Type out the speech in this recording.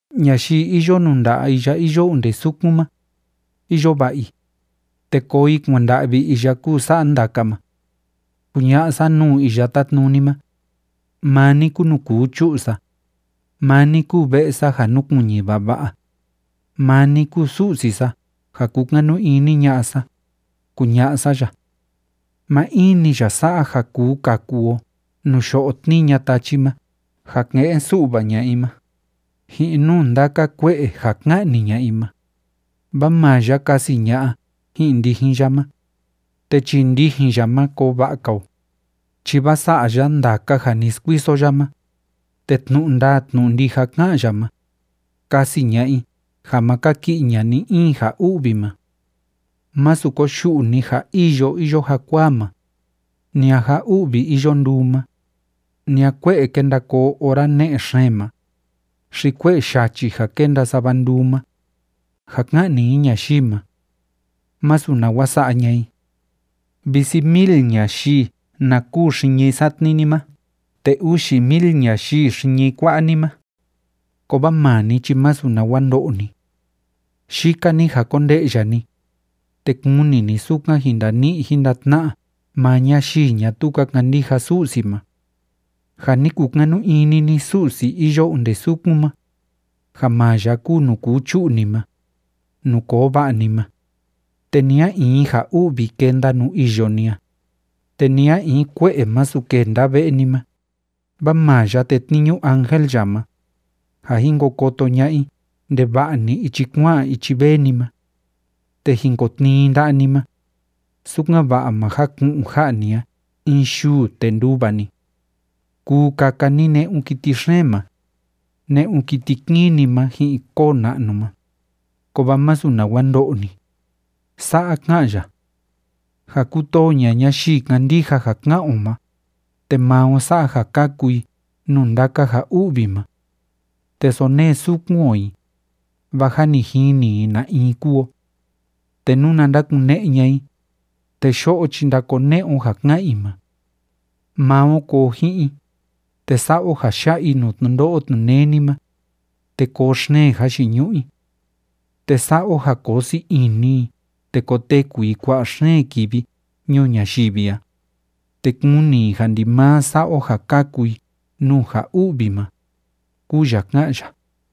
Ñayii iyo nuu nda'a iya iyo onde sukun ma, iyo va'a i, te koo i kuanda'vi iya kúu sa'a ndaka ma. Kuña'a sa nuu Iya Tátnuni ma: “Maa ni kúu nuu kuu chu'u sa. Maa ni kúu ve'e sa ja núkuiñi vava'a. Maa ni kúu Su'si sa ja kúkanu ini ña'a sa”, kuña'a sa ya. Maa in‑ni ya sa'a ja kuu kaku o nuu yo'o tníi ña'a tachi ma ja ke'en su'va ña'a i ma, ji'in nuu ndaka kue'e ja ka'ni ña'a i ma, vaa maa ya kasi ña'a ji'in ndijin ya ma, te chii ndijin ya ma koo va'a‑ka o, chi vaa sa'a ya ndaka ja ni skuiso ya ma, te tnu'u ndaa tnu'u ndija ká'an ya ma, kasi ña'a i ja ma kaki'i ña'a ni‑in ja u'vi ma. Masu koyu'u ni ja îyo iyo jakuaa ma, ni a ja u'vi iyo nduu ma, ni a kue'e kenda koo ora ne'e xeen ma, xi kue'e yachi ja kenda sava nduu ma, ja ka'ni i ñayii ma, másu nawa sa'a ña'a i. Visi mil ñayii na kûu xiñi satni ni ma te uxi mil ñayii xiñi kua'a ni ma, kovaa maa ni chi másu nawa ndo'o ni. Yika‑ni ja konde'ya ni, te kuni ni sukan jin ndani'i jin ndatna'a maa ñayii ñatuu ka kandija Su'si ma. Ja ni kukanu ini ni Su'si iyo onde sukun ma, ja maa ya kúu nuu kuu chu'u ni ma, nuu koo va'a ni ma, te ni a in ja u'vi kenda nuu iyo ni a, te ni a in kue'e masu kenda ve'e ni ma, vaa maa ya tetniñu ángel ya ma, ja jin ko koto ña'a i ndeva'a‑ni ichi kua'an ichi vee ni ma. Te jin kotnii i nda'a ni ma, sukan‑va'a ma jaku'un ja'a ni a in yuu te nduva ni. Kuu kaka ni ne'un kiti xeen ma, ne'un kiti kini ma ji'in koo na'nu ma, kovaa masu nawa ndo'o ni. Sa'a ka'an ya: “Ja kutoo ña'a ñayii kándija ja ká'an o ma, te maa o sa'a ja kaku i nuu ndaka ja u'vi ma. Te sonee sukun o i, vaa jâ ni jini i na in kúu o. Te nuna ndakune'e ña'a i, te yo'o chi ndakone'e o ja ká'an i ma. Maa o koo ji'in i, te sa'a o ja ya'a i nuu tnundo'o tnuneni ma, te koo xeen jayiñu'u i. Te sa'a o ja koo sii ini i te koteku i kua'a xeen kivi ñuu ñayivi a, te kuni i ja ndimaa sa'a o ja kaku i nuu ja u'vi ma”, kúu ya ká'an ya.